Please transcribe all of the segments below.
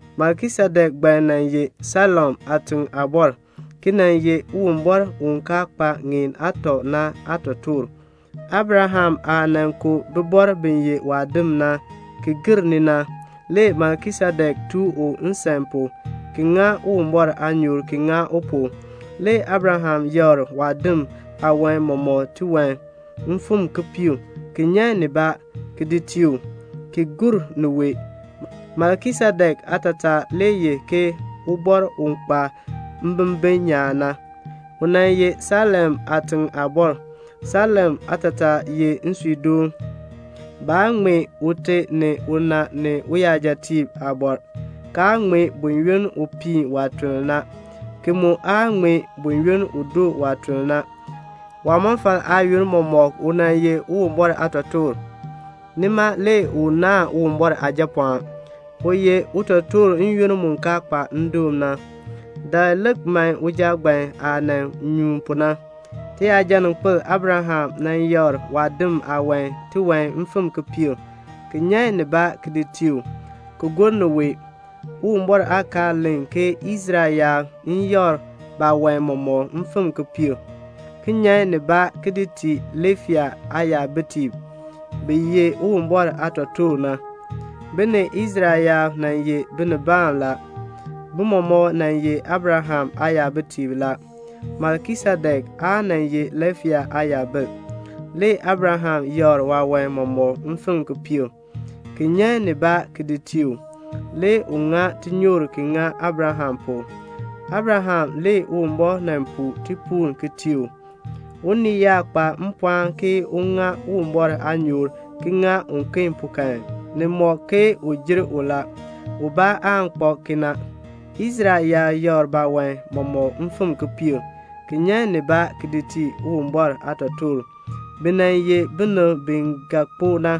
Melkisedek ngbaan nan ye Salem aatiŋ aabɔr, ki nan ye Uwumbɔr u kaa kpa ŋeen aatɔ na aatotoor. Abraham aah nan ku bibɔrb bi ye waadim na ki gir ni na, le Melkisedek tooh u nsan pu ki ŋa Uwumbɔr aanyoor ki ŋa u pu. Le Abraham yakr waadim aawan mɔmɔk tiwan kipiik, ki nyan nibaa, ki di tii u, ki gur niwae. Melkisedek aatataa ye ubɔr u kpa mbimbin nyaan na. U nan ye Salem aatiŋ aabɔr. Salem aatataa ye nsuudoon. Baa ŋmee ute ni una ni uyajatiib aabɔr, kaa ŋmee buyoonn u piin waatuln na, ki mu aa ŋmee buyoonn u doo waatuln na. Waamɔfal aayoonn mɔmɔk u nan ye Uwumbɔr aatotoor. Nima le u naahn Uwumbɔr Aajapɔɔn, u ye utotoor n-yoonn mu kaa kpa ndoon na. Dakl lik man uja ngbaan aah nan nyuun pu na; tiyajaninkpil Abraham yakr waadim aawan tiwan kipiik, ki nyan nibaa ki di tii u, ki gur niwae. Uwumbɔr aakaal len ke Israel yaab n yakr baawan mɔmɔk kipiik, ki nyan nibaa ki di tii Liifai aayabitiib, bi ye Uwumbɔr aatotoortiib na. Bi ni Israel yaab nan ye binibaan la. Bi mɔmɔk nan ye Abraham aayabitiib la. Melkisedek aa nan ye Liifai aayabil, le Abraham yakr waawan mɔmɔk kipiik, ki nyan nibaa ki di tii u. Le u ŋa tinyoor ki ŋa Abraham pu. Abraham le Uwumbɔr nan puu tipuul ki tii u. Unii yaa kpa mpɔɔn ke un ŋa Uwumbɔr aanyoor ki ŋa uken pu kan, u jer u la. Ubaa aan kpak kena. Israel yaab yakr baawan mɔmɔk kipiik, ki nyan nibaa ki di tii Uwumbɔr aatotoortiib, bi nan ye binib bi ga kpo na.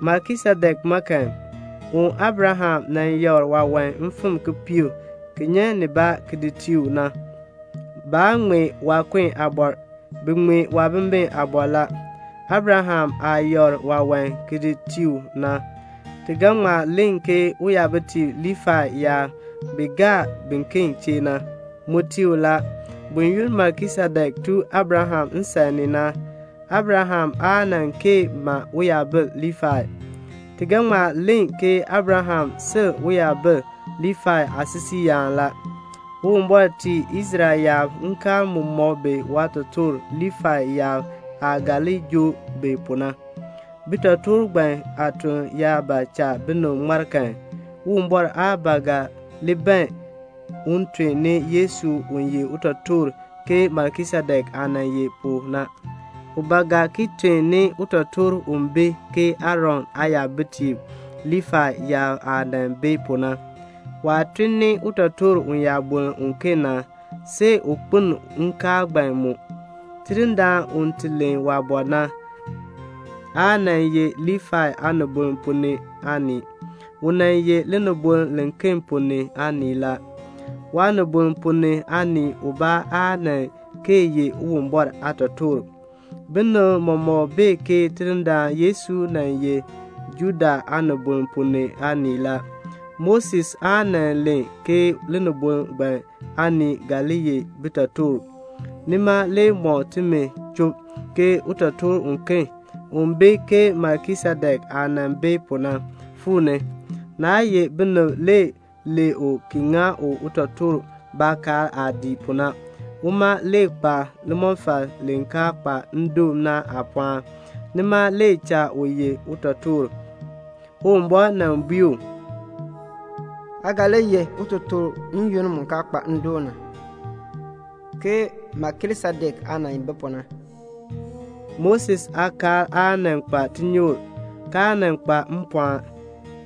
Melkisedek ma kan, u Abraham yakr waawan kipiik ki nyan nibaa ki di tii u na, baa ŋmee waakun aabɔr. Bi ŋmee waabimbin aabɔr la. Abraham aah yakr waawan ki di tii u na, ti ga ŋma len ke uyabitiib Liifai yaab bi gaa biken chee na, mu tii u la. Buyoonn Melkisedek tooh Abraham nsan ni na, Abraham aa nan kee ma uyabil Liifai. Ti ga ŋma len ke Abraham sil uyabil Liifai aasisiiyaan la. Uwumbɔr tii Israel yaab nkaal mu mɔk bi waatotoortiib Liifai yaab aah ga li joo bi pu na. Bitotoortiib ngbaan aatuln yaa ba cha binib ŋmar kan, Uwumbɔr aa ba ga li ban un tun ni Yesu u ye utotoor ke Melkisedek aah nan ye pu na. U ba ga ki tun ni utotoor u bi ke Aaron aayabitiib Liifai yaab aah nan bi pu na. Waah tun ni utotoor uyaaboln uken na, see u kpeln nkaal ngbaan mu. Tidindaan u ti len waabɔr na, aa nan ye Liifai aanibol ponn ni aanii. U nan ye linibol liken ponn ni aanii la. Waanibol ponn ni aanii ubaa aa nan kee ye Uwumbɔr aatotoor. Binib mɔmɔk bee ke Tidindaan Yesu nan ye Juda aanibol ponn ni aanii la. Moses aa nan len ke linibol ngbaan aanib ga li ye bitotoortiib. Nima le mɔk timi chub ke utotoor uken, u bi ke Melkisedek aah nan bi pu na, fuu ni. Naa ye binib le lee u ki ŋa u utotoor baakaal aah dii pu na. Uma le kpa limɔfal li kaa kpa ndoon na aapɔɔn. Nima le cha u ye utotoor. Uwumbɔr nan bui u, "Aa ga li ye utotoor n-yoonn mu kaa kpa ndoon na ke Melkisedek aah nan bi pu na." Moses aakaal aa nan kpa tinyoor, kaa nan kpa mpɔɔn,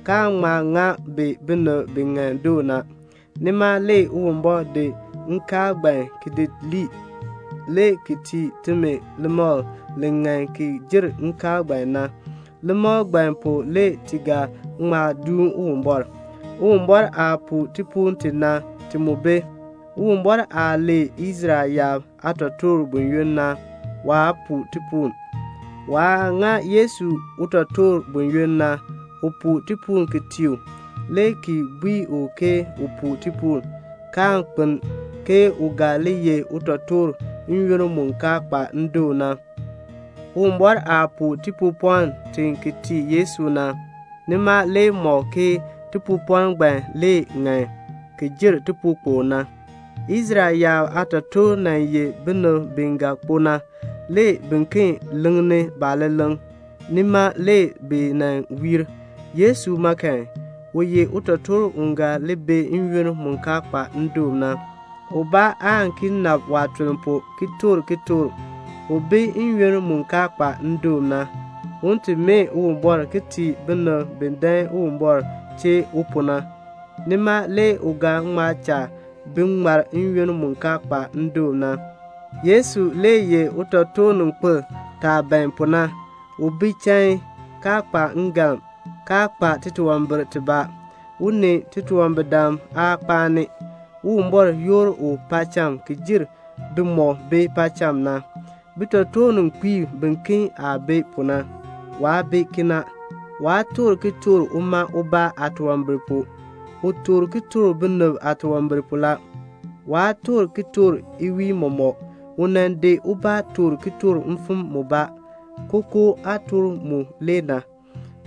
kaa ŋma ŋa bi binib bi ŋan doo na. Nima le Uwumbɔr di nkaal ngbaan ki di lii, le ki tii timi limakl li ŋan ki jer nkaal ngbaan na. Limakl ngbaan pu le ti ga ŋma duun Uwumbɔr. Uwumbɔr aah puu tipuul ti na, ti mu bi. Uwumbɔr aah lee Israel yaab aatotoortiib buyoonn na, waa puu tipuul. Waah ŋa Yesu utotoor buyoonn na, u puu tipuul ki tii u, le ki bui u ke u puu tipuul, kaan kpeln, ke u ga li ye utotoor n-yoonn mu kaa kpa ndoon na. Uwumbɔr aah puu tipuupɔln ti ki tii Yesu na, nima le mɔk ke tipuupɔln ngbaan le ŋan ki jer tipuukpokl na. Israel yaab aatotoortiib nan ye binib bi ga kpo na, le biken leŋni baaleleŋ. Nima le bi nan wiir. Yesu ma kan, u ye utotoor u ga li bi n-yoonn mu kaa kpa ndoon na. Ubaa aan ki nabr waatuln pu ki toor kitork. U bi n-yoonn mu kaa kpa ndoon na, un ti mee Uwumbɔr ki tii binib bi dan Uwumbɔr chee u pu na. Nima le u ga ŋma cha bi ŋmar n-yoonn mu kaa kpa ndoon na. Yesu le ye utotoorninkpil taah ban pu na. U bi chain, kaa kpa ngalm, kaa kpa titunwambir tibaa. U ni titunwambirdam aa kpaan. Uwumbɔr yoor u ki jer bimɔk bi paacham na. Bitotoorninkpiib biken aah bi pu na, waa bi kena. Waa toor kitork uma ubaa aatunwambir pu. U toor kitork binib aatunwambir pu la. Waa toor kitork iwiin mɔmɔk. U nan di ubaa toor kitork, kookoo aatork le na.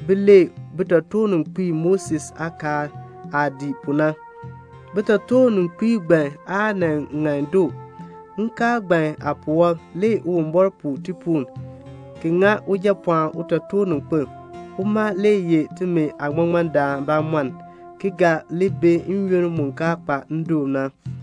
Bi lee bitotoorninkpiib Moses aakaal aah dii pu na. Bitotoorninkpiib ngbaan aa nan ŋan doo. Nkaal ngbaan aapuwɔb le Uwumbɔr puu tipuul, ki ŋa Ujapɔɔn utotoorninkpil. Uma le ye timi aaŋmaŋmardaan bamɔnn, ki ga li bi n-yoonn mu kaa kpa ndoon na.